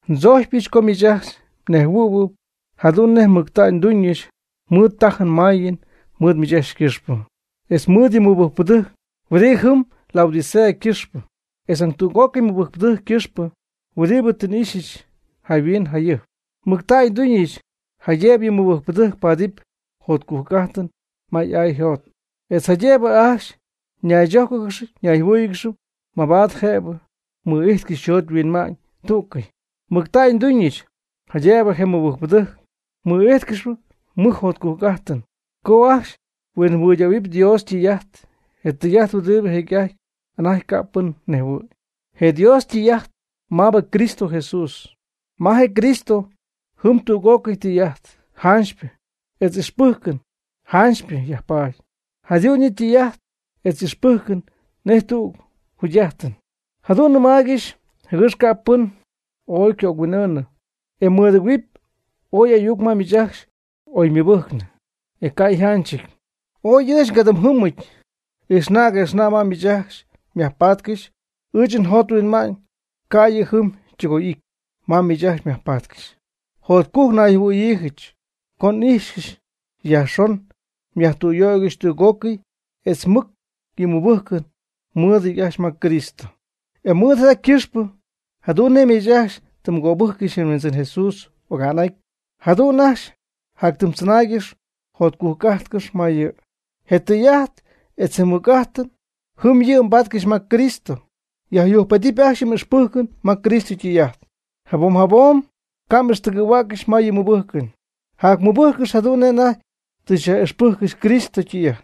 Ndzojcpyɨch co miich ajcxy mnejhuɨ̈huɨpy jadu'n nej mɨctägy nduuñɨch mɨɨd tajɨn mayɨn mɨɨd miich ajcxy ycɨxpɨ, etz mɨɨd yɨ mɨbɨjcpɨdɨjc huɨdi jɨm Laodicea ycɨxpɨ, etz nañ tüg'ócɨy mɨbɨjcpɨdɨjc ycɨxpɨ huɨdibɨ tɨ xy'ixyɨch ahuin ajɨjp. Mɨctägy nduuñɨch jaydëbɨ yɨ mɨbɨjcpɨdɨjc paadɨpy jotcujc'ajtɨn ma y'ay yjot, etz jaydëbɨ ajcxy ñaychójcɨgɨxɨpy ñayjɨhuɨ́ɨyɨgɨxɨpy mabaad jëbɨ mɨ'ijtcɨxy yjot yhuinma'ñ tú'cɨy. Mɨctägy nduuñɨch jaydëbɨ je mɨbɨjcpɨdɨjc mɨ'ijtcɨxy mɨj jotcujc'ajtɨn co ajcxy huinjɨhuɨydähuɨɨb Dios ytɨy'ajt, je tɨy'ajt huɨdibɨ jecy'ajty anajty ca' pɨn nejhuɨ̈y, je Dios ytɨy'ajt maabɨ Cristo Jesús. Ma je Cristo jɨm tüg'ócɨy tɨy'ajt janchypɨ etz ixpɨjcɨn janchypɨ yajpaady. Jadu'n yɨ' ytɨy'ajt etz y'ixpɨjcɨn nej tüg jugy'ajtɨn. Jadu'n nɨmaaygɨxy jɨgɨx ca' pɨn oy cohuin'ɨɨnɨ e mɨdɨgɨ̈huɨpy oy ayuc ma miich ajcxy ooy ymɨbɨjcnɨ, e ca'yjanchɨty. Ooy ɨɨch ngadɨm jɨmɨty, ixna' guëxna' ma miich ajcxy myajpatcɨxy. Ɨɨch njot nhuinma'ñ ca' yɨ' jɨm ytɨgoy'ity ma miich ajcxy myajpatcɨxy. Jotcujc nayjɨhuɨ̈yiijɨch co n'ijxcɨxy yajxon myajtüyöygɨxy tüg'ócɨy etz mɨc yɨ mmɨbɨjcɨn mɨɨdɨty ajcxy ma Cristo. E mɨɨd jada ycɨxpɨ jadu'n nej miich ajcxy tɨ mgöbɨjccɨxy je Huindzɨn Jesús oga'n'aty, jadu'n ajcxy jactzɨnaaygɨx jacjugy'ajtcɨx ma yɨ'. Je tɨy'ajt etz je mɨc'ajt jɨm yɨ' mbaatcɨxy ma Cristo. Yjacyujcpedɨpy ajcxy yɨ m'ixpɨjcɨn ma Cristo ytɨy'ajt jabom jabom. Ca' m'ixtɨgɨ̈huäccɨxy ma yɨ mmɨbɨjcɨn. Jacmɨbɨjcɨx jadu'n nej anajty tɨ nyaj'ixpɨjccɨxy Cristo ytɨy'ajt.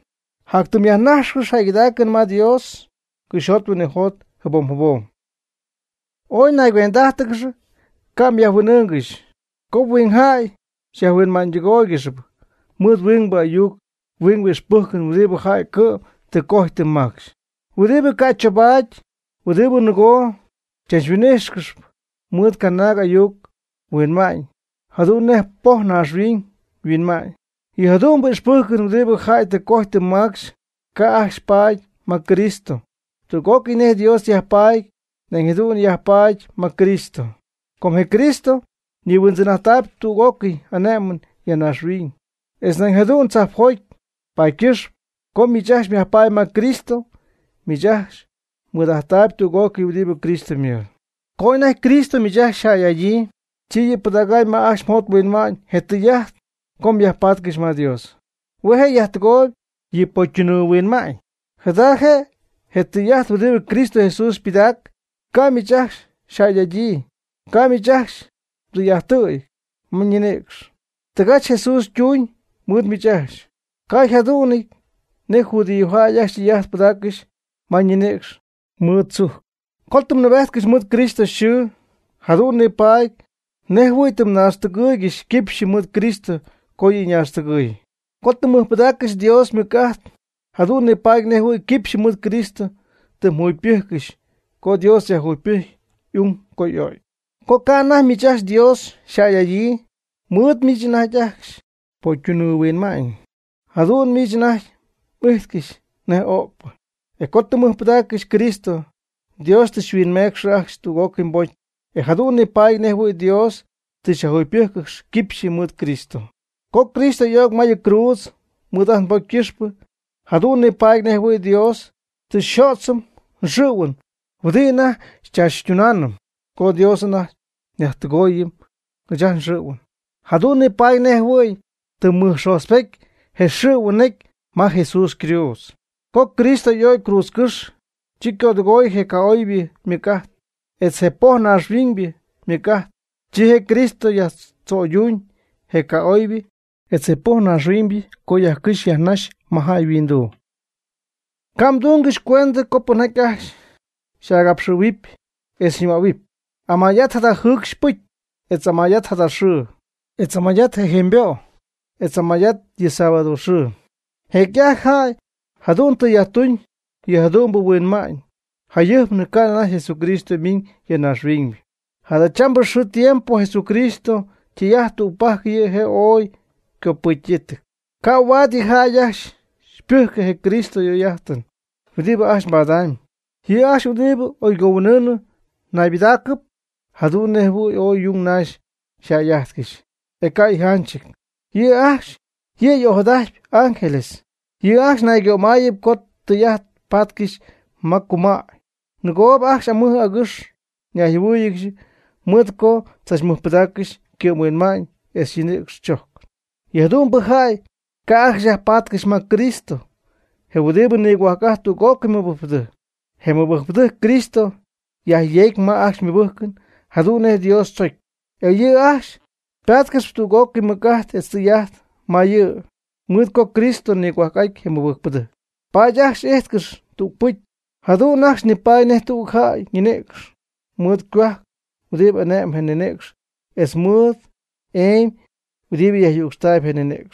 Jatytɨm myajnájxcɨxɨpy jäygɨdaacɨn ma Dios cɨxyjot huinɨjot jabom jabom. Ooy naygüend'ájtɨgɨx, ca' myajhuin'ɨɨngɨxy, co huingjäy xyajhuinma'ñytɨgóoygɨxɨpy mɨɨd huingbɨ ayuc huingpɨ ixpɨjcɨn huɨdibɨ jäy cɨ'm tɨ cojy tɨ macxy, huɨdi ca' choobaady, huɨdi nɨgoo xychachhuin'ɨɨngɨxp mɨɨd canaag ayuc huinma'ñ jadu'n nej poj naaxhuiñ huinma'ñ. Yɨ jadu'mbɨ ixpɨjcɨn huɨdibɨ jäy tɨ cojy tɨ macxy ca' ajcxy paady ma Cristo. Tüg'ócɨy nej Dios yajpaady nañ jadu'n yajpaady ma Cristo. Com je Cristo ñihuindzɨn'ajttaayb tüg'ócɨy ane'mɨn ya naaxhuiñ, etz nañ jadu'n tzajpjoty, paady ycɨxpɨ co miich ajcxy myajpaady ma Cristo, miich ajcxy mɨɨd'ajttaayb tüg'ócɨy huɨdi Cristo ymɨɨd. Co anajty Cristo miich ajcxy xyjäy'adyii, chi yɨ'pɨdacy ma ajcxy mjot mhuinma'ñ je tɨy'ajt co myajpatcɨxy ma Dios. Hue' je' yajtɨgooyb yɨ pocytunɨɨ huinma'ñ. Jada je' je tɨy'ajt huɨdi Cristo Jesús ypɨdac, ca' miich ajcxy xyjäy'adyii. Ca' miich ajcxy mdɨy'ajttɨ̈y ma mninïcx. Tɨgach Jesús ytuuñ mɨɨd miich ajcxy, ca' yjadu'nɨty nej judíojäy ajcxy tɨy'ajt pɨdaaccɨxy ma ñinïcx mɨɨd tzujc. Co tɨ mnɨɨbejtcɨxy mɨɨd Cristo yxɨɨ, jadu'n nipaady nejɨhuɨ̈y tɨ mnaaxtɨgɨɨygɨxy quipxyɨ mɨɨd Cristo co yɨ' ñaaxtɨgɨɨy. Co tɨ mmɨjpɨdaaccɨxy Dios ymɨc'ajt jadu'n nipaady nejɨhuɨ̈y quipxyɨ mɨɨd Cristo tɨ mjugypɨjccɨxy co Dios yajjugypɨjcy y'ung co y'o'cy. Co ca' anajty miich ajcxy Dios xyjäy'adyii, mɨɨd miich anajty ajcxy pocytunɨɨ huinma'ñ jadu'n miich anajty m'ijtcɨxy nej öcpɨ. E co tɨ mmɨjpɨdaaccɨxy Cristo, Dios tɨ xyhuinmeecxɨ ajcxy tüg'ócɨy mbocy, e jadu'n nipaady nejɨhuɨ̈y Dios tɨ xyajjugypɨjccɨxy quipxyɨ mɨɨd Cristo. Co Cristo y'o'cy ma yɨ cruudz mɨɨd ajt nbocy ycɨxpɨ, jadu'n nipaady nejɨhuɨ̈y Dios tɨ xyjödzɨm xɨ̈huin huɨdi anajty xychaachytunaanɨm. Co Dios anajty yajtɨgooy ɨɨch ajt nxɨ̈huɨn, jadu'n nipaady nejɨhuɨ̈y tɨ mɨjxojtzpety je xɨ̈huɨn necy ma Jesús ycruudz. Co Cristo y'o'cy cruudzcɨ́xy, chi ycödɨgooy je ca'oybɨ ymɨc'ajt, etz je poj naaxhuiñybɨ ymɨc'ajt. Chi je Cristo yajtzo'yduñ je ca'oybɨ etz je poj naaxhuiñybɨ co yajcɨjxy yajnaxy ma jäy yhuinduu. Ca' mdungɨxy cuentɨ co pɨnjaty ajcxy xy'agapxɨ̈huɨpy etz xyñɨmähuɨpy: ―Amay'at jada jɨɨcxy pɨcy, etz amay'at jada xɨɨ, etz amay'at je jemybo', etz amay'at yɨ Sábado xɨɨ. Jecy'ajty jäy jadu'n tɨ yajtuñ yɨjadu'mbɨ huinma'ñ, jayɨjpnɨ ca' anajty Jesucristo ymiiñɨ ya naaxhuiñ. Jadachambɨ xɨɨ tiempo Jesucristo ytɨy'ajt tügpajc yɨ' je' ooy ycopɨcyɨty. Ca' huaad yɨ jäy ajcxy xypɨjcɨ je Cristo y'oy'ajtɨn huɨdibɨ ajcxy mbadamyb. Yɨ' ajcxy huɨdi oygohuin'ɨɨnɨɨ naybɨdaacɨp jadu'n nejɨhuɨ̈y ooy yung naxy ajcxy yjäy'ajtcɨxy, e ca' yjanchɨty. Yɨ' ajcxy yɨ' y'ojadajtpy ángeles. Yɨ' ajcxy naygömayɨp co tɨ tɨy'ajt patcɨxy ma cumäy, ninɨgoob ajcxy amɨj agɨx ñayjɨhuɨ́ɨyɨgɨxy mɨɨd co tzachmɨjpɨdaaccɨxy ycɨ'mhuinma'ñ etz ñinïcx chojcɨn. Yɨ jadu'mbɨ jäy ca' ajcxy yajpatcɨxy ma Cristo, je huɨdibɨ nigohuajc'ajtp tüg'ócɨy mɨbɨjcpɨdɨjc. Je mɨbɨjcpɨdɨjc Cristo yajyeecp ma ajcxy ymɨbɨjcɨn jadu'n nej Dios tzocy, e yɨ' ajcxy patcɨxy tüg'ócɨy mɨc'ajt etz tɨy'ajt ma yɨ'. Mɨɨd co Cristo nigohuajc'aty je mɨbɨjcpɨdɨjc, paady ajcxy y'ijtcɨxy tügpɨcy, jadu'n ajcxy nipaady nej tüg jäy ñinïcx mɨɨd ycohuajc huɨdi ane'm je ñinïcx etz mɨɨd emy huɨdibɨ yajyücxtaayb je ninïcx.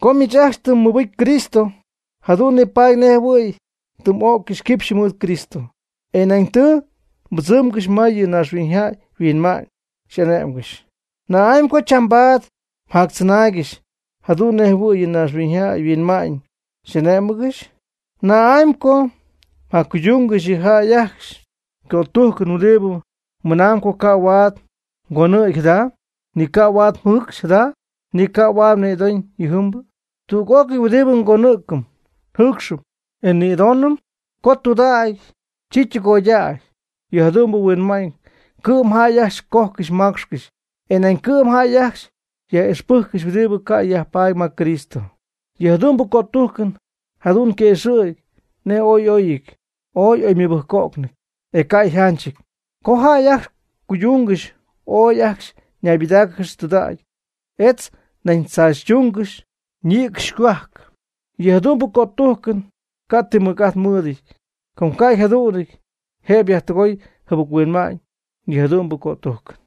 Co miich ajcxy tɨ mmɨbɨcy Cristo, jadu'n nipaady nejɨhuɨ̈y tɨ m'öccɨxy quipxyɨ mɨɨd Cristo, e nañ tɨ mbɨdzɨmgɨxy ma yɨ naaxhuiñyjäy yhuinma'ñ xyaj'ane'mgɨxy. ¿Na'ámy co chambaad mjactzɨnaaygɨxy jadu'n nej jɨhuɨɨy yɨ naaxhuiñyjay yhuinma'ñ xy'ane'mgɨxy? ¿Na'amy co mjaccuydungɨxy yɨ jäy ajcxy ycötujcɨn huɨdibɨ mɨnaamb co ca' huaad mgonɨ̈gy jada, ni ca' huaad mjɨɨcxy jada, ni ca' huaad nïdoñ yɨjɨmbɨ? Tüg'ócɨy huɨdibɨ ngonɨ̈cɨm, njɨɨcxɨm, e nnïdonɨm, co ytundäy, chi ytɨgoydäy. Yɨ jadu'mbɨ huinma'ñ cɨ'm jäy ajcxy cojcɨxy macxcɨxy, e nañ cɨ'm jäy ajcxy yaj'ijxpɨjccɨxy huɨdibɨ ca' yajpaady ma Cristo. Yɨ jadu'mbɨ cötujcɨn jadu'n yquëxɨ̈gy nej ooy y'oyɨty ooy y'oymɨbɨjco'cnɨty, e ca' yjanchɨty. Co jäy ajcxy cuydungɨxy ooy ajcxy ñaybɨdáacɨgɨxy tudägy, etz nañ chaachytungɨxy ñïcx ycohuajc. Yɨ jadu'mbɨ cötujcɨn ca' ti mɨc'ajt mɨɨdɨty, com co ca' jadu'n jëb yajtɨgoy jɨbɨc-huinma'ñ yɨ jadu'mbɨ cötujcɨn.